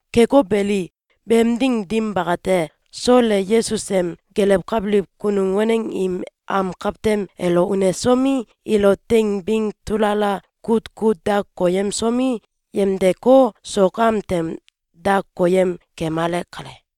Keko beli, beem ding dim bakate, Sol e Yesus em gelewkabiliw kunum waneng im am kawtem elo unesomi, ilo teing bing tulala kut kut da koyemsomi, yemdeko, sok am tem da koyem kemale kale.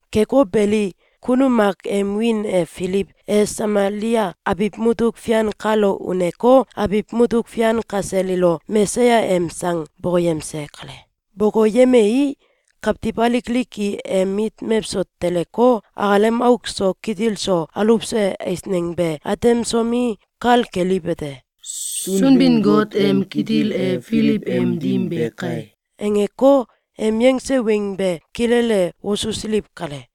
Keko beli, kunum mak em wiin e Filiw e Samalia abiw mutuk fian kalo uneko, abiw mutuk fian kasel ilo Mesaya em sang bokoyemse kale. Bokoyemei, kawtiw alik alik i em mit mewso teleko, akalem auk so kitil so aluwse eisneng be atemsomi, kal keliwete: “Sunbin-Got em kitil e Filiw em dim be kai!”, angeko, em yangse weng be kilele wosusiliw kale.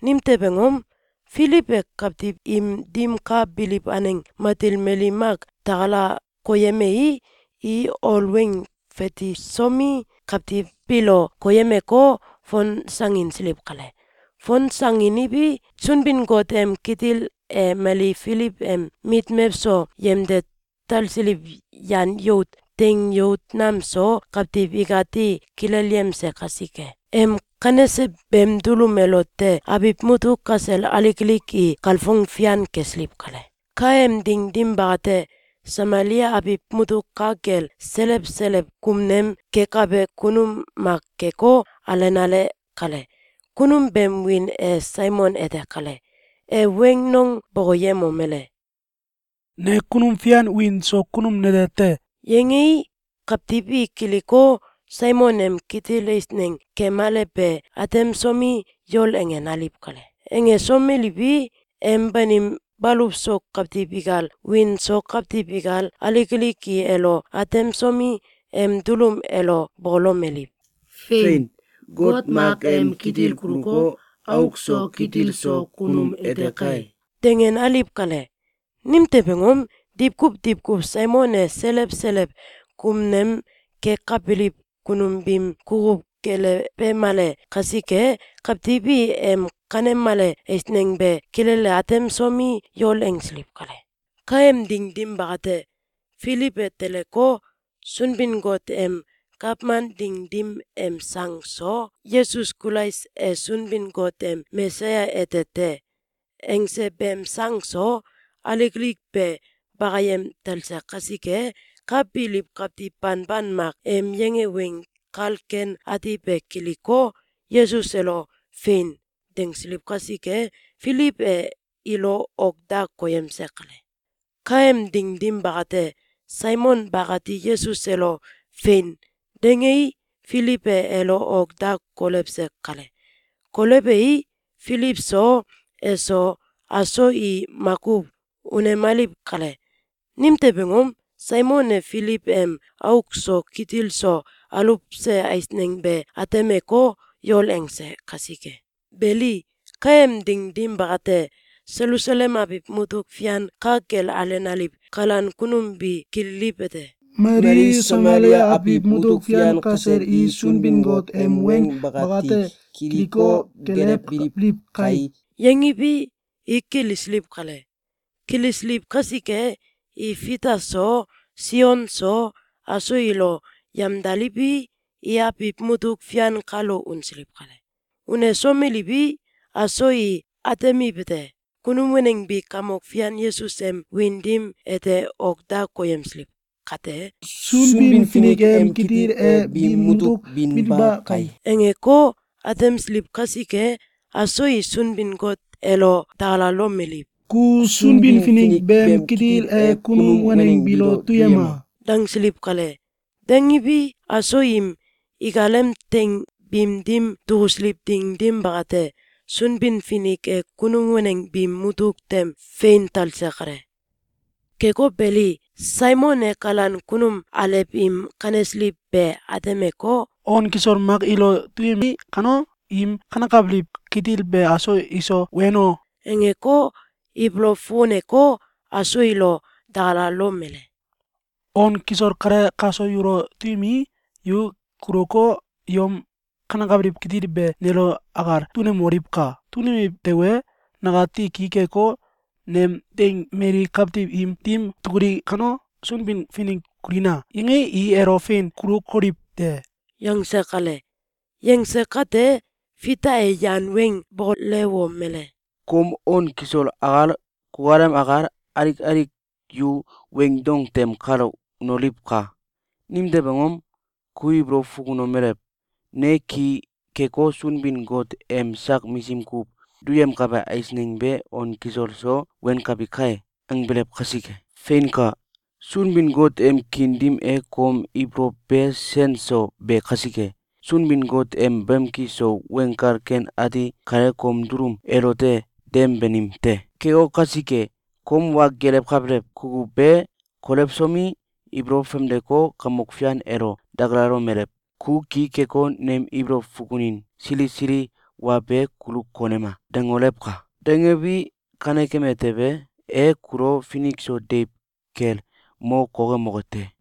Nimtew angom? Filiw e kawtiw im dim ka biliw aneng matil mali mak takala koyemei, i ol weng fatisomi, kawtiw biilo koyemeko, fonsanginsiliw kale. Fonsanginiwi, Sunbin-Got em kitil e mali Filiw em mit mewso yemde talsiliw yan yout, teing yout nam so kawtiw ikati kilelyemse kasike. Em kanese beem dulum elote abiw mutuk kasel alik alik i kalfong fian kesiliw kale. Kaem ding dim bakate, Samalia abiw mutuk ka kel selew selew kumnem kekabe kunum mak keko, alenale kale. Kunum beem wiin e Saimon ete kale. E weng nong bokoyemomele: “Ne kunum fian wiin so kunum nete te!”, yangei, kawtiw i kiliko, Saimon em kitil eisneng kemale be atemsomi, yol angenaliw kale. Angesomeliwi, em banim baluw so kawtiw ikal, wiin so kawtiw ikal, alik alik i elo atemsomi, em dulum elo bokolomeliw: “Fein! Got mak em kitil kuluko, auk so kitil so kunum ete kai!”, dangenaliw kale. Nimtew angom? Diwkuw diwkuw Saimon e selew selew kumnem kekabiliw kunum biim kukuw gelewemale kasike, kawtiw i em kanemale eisneng be kilele atemsomi, yol angsiliw kale. Kaem ding dim bakate, Filiw e teleko, Sunbin-Got em gawman ding dim em sang so, “Yesus Kulais e Sunbin-Got em Mesaya ete te!”, angse beem sang so, alik alik be bakayem talse kasike, ka biliw kawtiw banban mak em yange Weng Kal Ken Ati be kiliko, Yesus elo “Fein!”, dangsiliw kasike, Filiw e ilo ok da koyemse kale. Kaem ding dim bakate, Saimon bakati Yesus elo “Fein!”, dangei, Filiw e elo ok da kolewse kale. Kolewei, Filiw so, eso, aso i makuw unemaliw kale. Nimtew angom? Saimon e Filiw em auk so kitil so aluwse eisneng be atemeko, yol angse kasike. Beli, kaem ding dim bakate, Selusalem abiw mutuk fian ka kel alenaliw kalan kunum bi kililiwete: “Mali Samalia abiw mutuk fian kasel i Sunbin-Got em weng bakati kiliko, gelewbiliw kai!”, yangiwi, i kilisiliw kale. Kilisiliw kasike, i Fita so, Sion so, aso ilo yamdaliwi, i abiw mutuk fian kalo unsiliw kale. Unesomeliwi, aso i atemiwete: Kunum waneng bi Kamok Fian Yesus em wiin dim ete ok da koyemsiliw kate, “Sunbin-Finik em kitil e biim mutuk binba kai!”, angeko, atemsiliw kasike, aso i Sunbin-Got elo dakalalomeliw: “Ku Sunbin-Finik beem kitil e kunum waneng biilo duyema!”, dangsiliw kale. Dangiwi, aso im ikalem teing biim dim dukusiliw ding dim bakate, Sunbin-Finik e kunum waneng biim mutuk tem fein talse kale. Keko beli, Saimon e kalan kunum alew im kanesiliw be atemeko, “On kisol mak ilo duyemi kano, im kanekabiliw kitil be aso iso weno!”, angeko, ibolow fukuneko, aso ilo dakalalomele: “On kisol kale kaso yulo duyemii, yu kuluko, yom kanekabiliw kitil be nelo akal dunemoliwka! Dunemiw tewe, nakati ki keko, nem teing mali kawtiw im dim dukuli kano, ‘Sunbin-Finik kulina!’, yangii, i elo fein kulokoliw te.”, yangse kale. Yangse kate, Fita e yan weng bokolewomele: “Kom on kisol akal, kukalem akal, alik alik yu weing dong tem kalo unoliwka! Nimtew angom? Ku ibolow fukunomelew: ‘Ne ki keko, Sunbin-Got em sak misim kuw duyemkabe eisneng be on kisol so wenkabi kai!’, angbelew kasike! Feinka! Sunbin-Got em kiin dim e kom ibolow be sen so be kasike, Sunbin-Got em bamki so Weng Kal Ken Ati kale kom dulum elote dem banim te. Keko kasike, kom wa gelewkabelew kukuw be kolewsomi, ibolow famdeko, Kamok Fian elo dakalalomelew: “Ku ki keko, nem ibolow fukunin sili sili wa be kulu konema!”, dangolewka! Dangewi, kanekeme tewe, e kulo finik so deiw kel mo kokemoke te.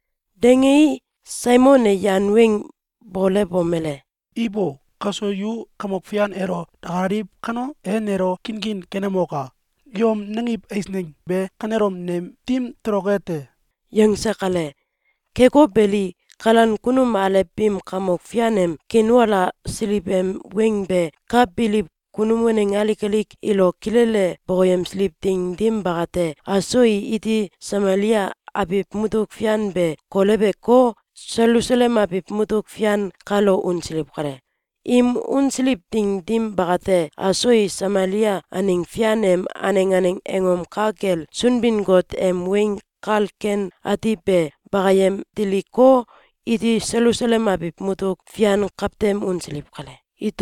Dangei, Saimon e yan weng bokolewomele: “Ibo! Kaso yu Kamok Fian elo dakalaliw kano, e nelo kinkin kenemoka! Yom nangiw eisneng be kanelom nem dim toloke te!”, yangse kale. Keko beli, kalan kunum alew biim Kamok Fian em kiinwalasiliw em weng be ka biliw kunum waneng alik alik ilo kilele bokoyemsiliw ding dim bakate, aso i iti Samalia abiw mutuk fian be koleweko, Selusalem abiw mutuk fian kalo unsiliw kale. Im unsiliw ding dim bakate, aso i Samalia aneng fian em aneng aneng angom ka kel Sunbin-Got em Weng Kal Ken Ati be bakayem diliko, iti Selusalem abiw mutuk fian kawtem unsiliw kale.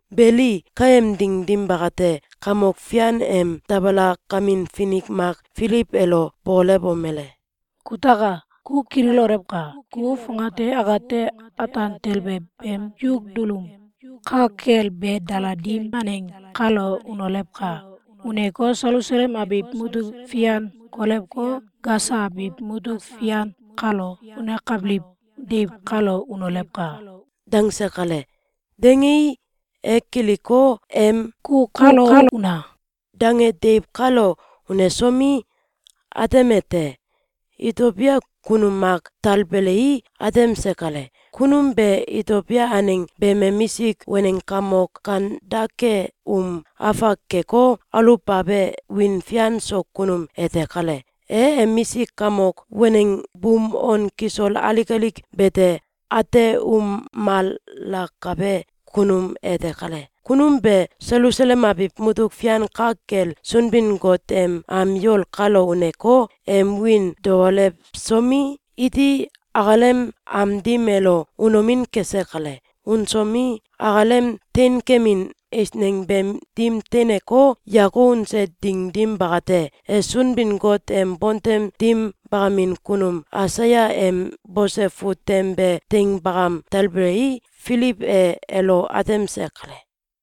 Beli, kaem ding dim bakate, Kamok Fian em dabalakamin finik mak Filiw elo bokolewomele: “Kutaka! Ku kililolewka! Ku fongate akate ataan tele beem yuk dulum ka kel be daladim aneng kalo unolewka! Uneko, Selusalem abiw mutuk fian kolewko, Gasa abiw mutuk fian kalo unekabiliw deiw kalo unolewka!”, dangse kale. Dangei, e kiliko, em “Ku kalo una!”, dange deiw kalo unesomi, atemete: Itobia kunum mak talbelei, atemse kale. Kunum be Itobia aneng beem emisik waneng kamok Kandake um afak keko, aluwbabe wiin fian so kunum ete kale. E emisik kamok waneng buum on kisol alik alik bete ateumalakabe kunum ete kale. Kunum be Selusalem abiw mutuk fian ka kel Sunbin-Got em am yol kalo uneko, em wiin daolewsomi, iti akalem am dim elo unomin kese kale. Unsomi, akalem teinkemin eisneng beem dim teineko, yako unse ding dim bakate, e Sunbin-Got em bontem dim bakamin kunum Aisaya em bose fut tem be teing bakam talbelei, Filiw e elo atemse kale.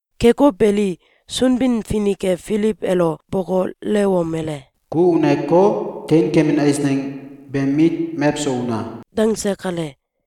Keko beli, Sunbin-Finik e Filiw elo bokolewomele: “Ku uneko, teinkemin eisneng beem mit mewso una!”, dangse kale.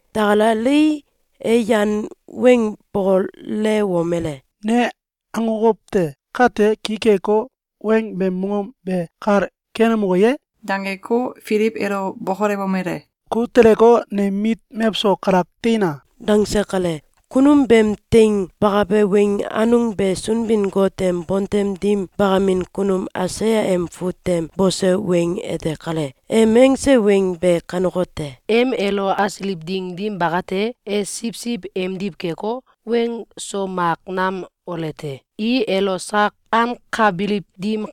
Dakalalei, e yan weng bokolewomele: “Ne akokow te. Kante ki keko, weng beem mongom be kal kenemoke ye?”, dangeko, Filiw elo bokolewomele: “Ku teleko, nem mit mewso kalak teina!”, dangse kale. Kunum beem teing bakabe weng anung be Sunbin-Got em bontem dim bakamin kunum Aisaya em fut tem bose weng ete kale. Em angse weng be kanekote: ‘Em elo asiliw ding dim bakate, e siwsiw emdiw keko, weng so mak nam ole te. I elo sak ankabiliw dim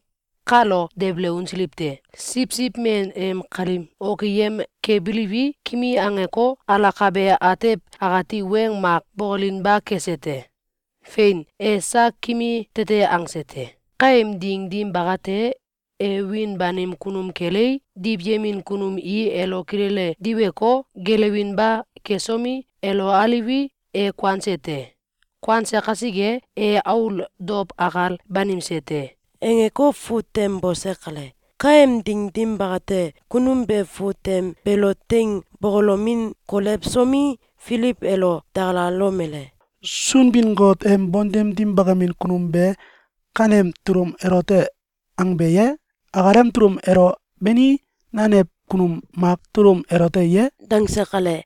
kalo debele unsiliw te. Siwsiw men em kalim okiyem kebiliwi, kimi angeko, alakabe atew akati weng mak bokolinba kese te. Fein! E sak kimi tete angse te. Kaem ding dim bakate, e wiin banim kunum kelei, diwyemin kunum i elo kilele diweko, geelewinba kesomi, elo aliwi, e kuanse te. Kuanse kasike, e aul dow akal banimse te.’, angeko fut tem bose kale. Kaem ding dim bakate, kunum be fut tem beelo teing bokolomin kolewsomi, Filiw elo dakalalomele: “Sunbin-Got em bontem dim bakamin kunum be kanem dulum elote angbe ye? Akalem dulum elo, bani nanew kunum mak dulum elote ye?”, dangse kale.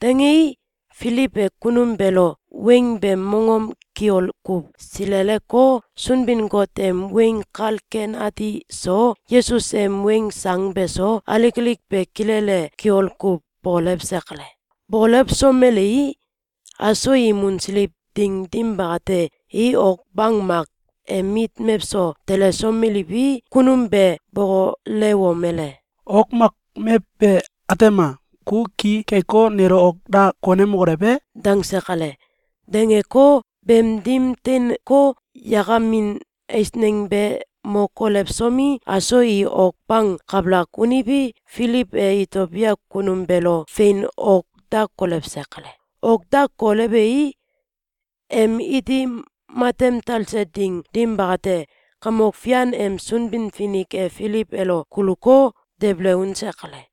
Dangei, Filiw e kunum beelo weng beem mongom kiol kuw sileleko, Sunbin-Got em Weng Kal Ken Ati so, Yesus em weng sang beso, alik alik be kilele kiol kuw bokolewse kale. Bokolewsomelei, aso im unsiliw ding dim bakate, i ok bang mak em mit mewso telesomeliwi, kunum be bokolewomele: “Ok mak mew be, atema! Ku ki keko, nelo ok da konemokolew e?”, dangse kale. Dangeko, beem dim teinko, yakamin eisneng be mo kolewsomi, aso i ok bang kabalak uniwi, Filiw e Itobia kunum beelo fein ok da kolewse kale. Ok da kolewei, em iti matem talse ding dim bakate, Kamok Fian em Sunbin-Finik e Filiw elo kuluko, debele unse kale.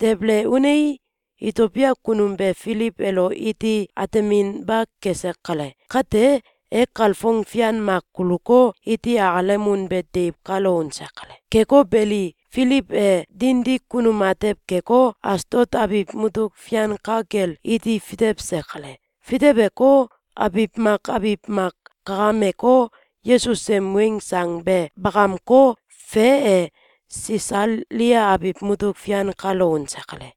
Debele unei, Itobia kunum be Filiw elo iti ateminba kese kale. Kate, e kalfong fian mak kuluko, iti akalem unbe deiw kalo unse kale. Keko beli, Filiw e dindi kunum atew keko, Asdot abiw mutuk fian ka kel iti fitewse kale. Fiteweko, abiw mak abiw mak kakameko, Yesus em weng sang be bakamko, fe e, Sisalia abiw mutuk fian kalo unse kale.